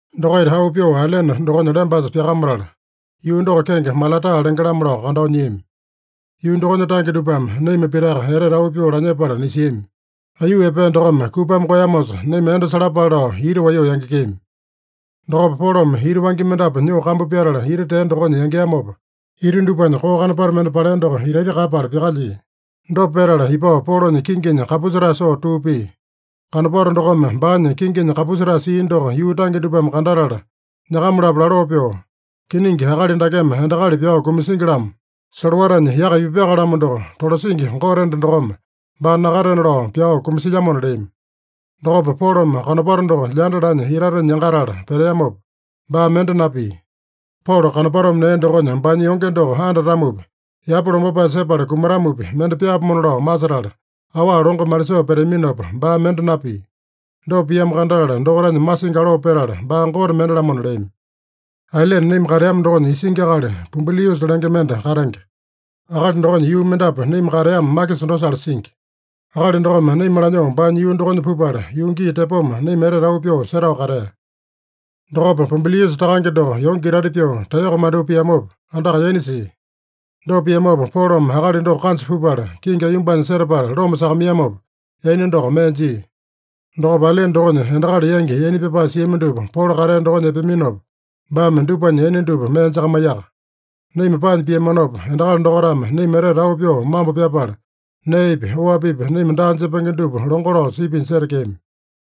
Dokaita auu pyoo ailene dokonya lembasa pyakamatala, yuu doko kenge Malataa lenge-lamo lao kandao nyiami. Yuu dokonya tange dupame naima pitaka etete auu pyoo lanyepala nisiami. Aiyuu epea dokome kupame koeyamosa, naima endo salapale lao ita waiyoo yangekeami. Dokopa Polome ita wangya mendapu nyoo kambu pyatala ita tea dokonya yangeamopa, ita dupanya koo kanopato mende palea doko itaita kaeyapala pyakalyia. Dopa petala ipao Polonya kinginya kapusetae soo tuu pia. Kanopato dokome baanya kinginya kapusetae sia doko yuu tange dupame kandatala nyakama-lapo laloo pyoo, “Kiningi, akali dakeme endakali pyao kumasingi-lamo. Solowatanya yaka ipupyaka-lamo doko, tolasingi gote enda dokome baa nakatena lao pyao kumasilyamona” leami. Dokopa Polome kanopato doko lyanda lanya itatenya yangatala peteamopa, baa mende napia. Polo kanopatome nea dokonya baanya yonge doko andatamopi, yapa lombapae sepala kumatamopi, mende pyaapomona lao masetala, awa longo malisoo peteaminopa, baa mende napia. Dopa piamo kandatala, dokaitanya masingi aloo petala, baa gote mende-lamona leami. Ailene naima kateama dokonya isingi akali Pubuliusa lenge mende katenge. Akali dokonya yuu mendapu naima kateama makisa dosale singi. Akali dokome naima lanyoo baanya yuu dokonya pupala, yuu gii tepoma naima etete auu pyoo setao katea. Dokopa Pubuliusa takange doko yonge itaita pyoo taeyoko mandyoo piamopa, andaka yaina sia. Dopa piamopa, Polome akali doko kanja pupala, kingi aiyombanya setapala loma sakamaiyamopa, yaina doko mee jia. Dokopa ailene dokonya endakali yangi yaina pyapae siami dupa Polo katea dokonya epeaminopa, baame dupanya yaina dupa mee jakamaiyaka. Naima paanya piamanopa, endakali dokaitame naima etete auu pyoo mambo pyapala, neepi, oapipi naima daa jepenge dupa longo lao sipinya setekeami.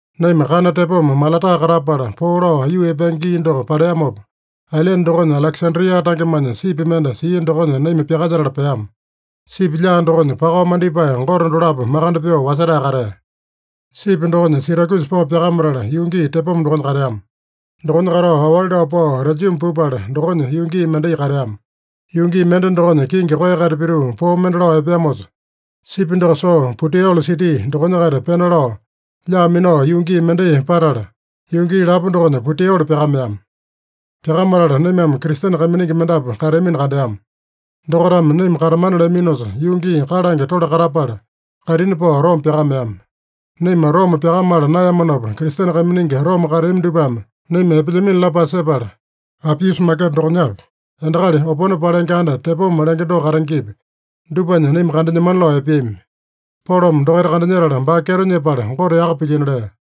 Naima kana tepoma Malataa katapala, poo lao aiyuu epenge gii doko paleamopa, ailene dokonya Alekesandria tangemanya sipi mende sia dokonya naima pyakalyetala peama. Sipi lyaa dokonya pakao mandipae gote dolapo makande pyoo wasetae katea. Sipi dokonya Sirakyusa pao pyakamatala yuu gii tepoma dokonya kateama. Dokonya katao aowali lao pao Rejiuma pupala, dokonya yuu gii mendai kateama. Yuu gii mende dokonya, kingi koeya-kaita pituu poo mende lao epeamosa, sipi doko soo Puteoli siti dokonya-kaita pena lao, lyaa minao yuu gii mendai patala, yuu gii lapo dokonya Puteoli pyakameama. Pyakamatala naimame Kristene kaiminingi mendapu kateamino kandeama. Dokaitame naima katamana leaminosa, yuu gii kalange tole katapala, kaitini pao Roma pyakameama. Naima Roma pyakamala naeyamanopa, Kristene kaiminingi Roma kateami dupame naima epelyamino lapae sepala, Apiusa Maketa dokonyapi, Endakali Opone Palenge Anda Tepoma lenge doko katengepi, dupanya naima kandanyemana lao epeami. Polome dokaita kandanyetala, baa kyeto nyepala, Gote yaka pilyino lea.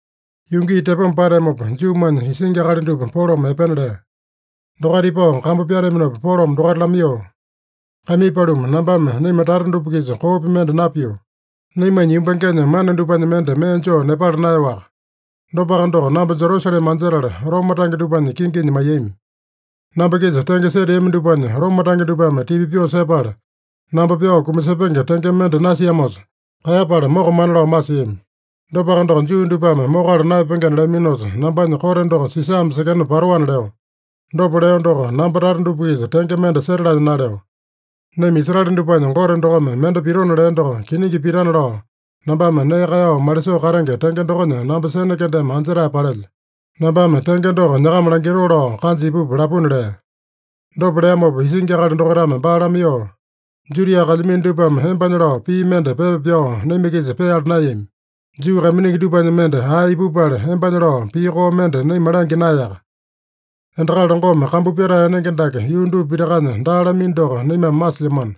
Yuu gii tepoma pateamopa, Juumanya isingi akali dupa Polome epena lea. Dokaita ipao kambu pyateaminopa Polome dokaita lamaiyoo, “Kaimii paluma, nambame naima tata dupa-kisa koopi mende napio. Naimanya yumbangenya mana dupanya mende mee joo nepala naeyoaka. Dopaka doko, namba Jerusalema anjetala, Roma tange dupanya kinginya maiyami. Namba-kisa tenge seteami dupanya Roma tange dupame tipa pyoo sepala, namba pyao kumasepenge tenge mende nasiamosa, kaeyapala mokamana lao masiami. Dopaka doko, Juu dupame mokala naeyapengena leaminosa, nambanya kote doko Sisame sekena patoana leo. Dopa leo doko, namba tata dupa-kisa tenge mende setalanya naleo. Naima Israele dupanya Gote dokome mende pitona lea doko kiningi pitana lao nambame nee kaeyao malisoo katenge tenge dokonya namba sene kendeme anjetae palelyo. Nambame tenge doko nyakama langitoo lao kanja ipupa lapuna” lea. Dopa leamopa isingi akali dokaitame baa lamaiyoo, “Judia kalyamino dupame embanya lao pii mende pepa pyao naima-kisa peala naeyami. Juu kaiminingi dupanya mende ae ipupala, embanya lao pii koo mende naima langya naeyaka. Endakali longome kambu pyatae enenge dake yuu dupa pitakanya daa lamino doko naimame masilyamano.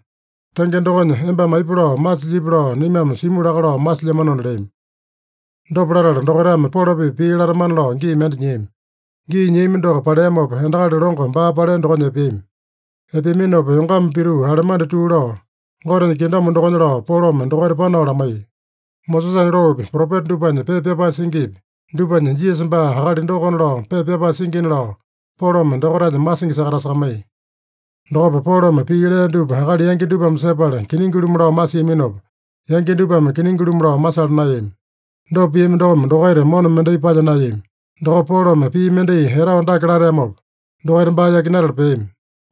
Tenge dokonya, embame aipa lao masilyipi lao naimame simu laka lao masilyamanona” leami. Dopa latala dokaitame Polo-pipa pii latamana lao gii mende nyiami. Gii nyiami doko paleamopa, endakali longo baa palea dokonya epeami. Epeaminopa yongama pituu, alemandi tuu lao, Gotenya kingdom dokonya lao Polome dokaita panao lamaiya. Mosesanya loopi, propeta dupanya pepa pyapae singipi, dupanya Jisasa baa akali dokona lao pepa pyapae singina lao Polome dokaitanya masingi sakatasakamaiya. Dokopa Polome pii lea dupa akali yangi dupame sepala kiningi-lumu lao masiaminopa, yangi dupame kiningi-lumu lao masala naeyami. Dopa piami dokome dokaita mona mendai palya naeyami. Dokopa Polome pii mendai etao dake lateamopa, dokaita baa yakinatala peami: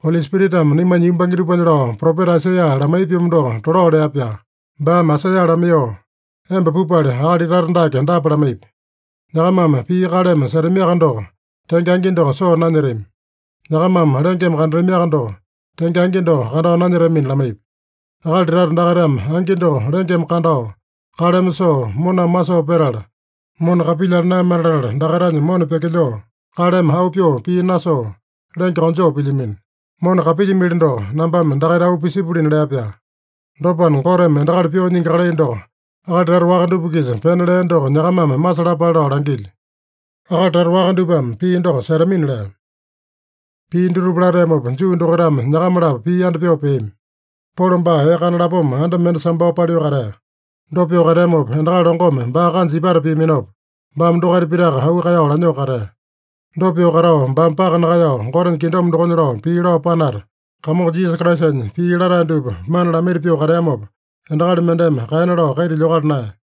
“Oli Spiritame naimanya yumbange dupanya lao propeta Aisaiya lamaiya-pyomo doko tolao lea-pyaa. Baame Aisaiya lamaiyoo, ‘Emba pupala, akali tata dake dapa lamaipi: “Nyakamame pii kaleme setamiaka doko, tenge angi doko soo nanyetami. Nyakamame lengeme kandatamiaka doko, tenge angi doko kandao nanyetamina” lamaipi. Akali tata dakaitame angi doko lengeme kandao, kaleme soo, moname masoo petala, mona kapilyala naeyamana latala, dakaitanya mona pyakilyoo, kaleme auu pyoo pii nasoo, lenge konjoo pilyamino. Mona kapilyimili doko, nambame dakaita auu pisipulina’ lea-pyaa. Dopana, Goteme endakali pyoo nyingi kalai doko akali tata waka dupa-kisa pena lea doko nyakamame masalapale lao langilyo. Akali tata waka dupame pii doko setamina” lea. Pii dutupa lateamopa, Juu dokaitame nyakama-lapo pii yanda pyoo peami. Polo baa ee kana lapoma anda mende sambao paliu katea. Dopa pyoo kateamopa, endakali longome baa kanja ipata piaminopa, baame dokaita pitaka auu kaeyao lanyoo katea. Dopa pyoo katao, baame paka nakaeyao Gotenya kingdom dokonya lao pii lao panata, Kamongo Jisasa Kraisanya pii latae dupa mana lamaita pyoo kateamopa, endakali mendeme kaena lao kaita lyokala naeya.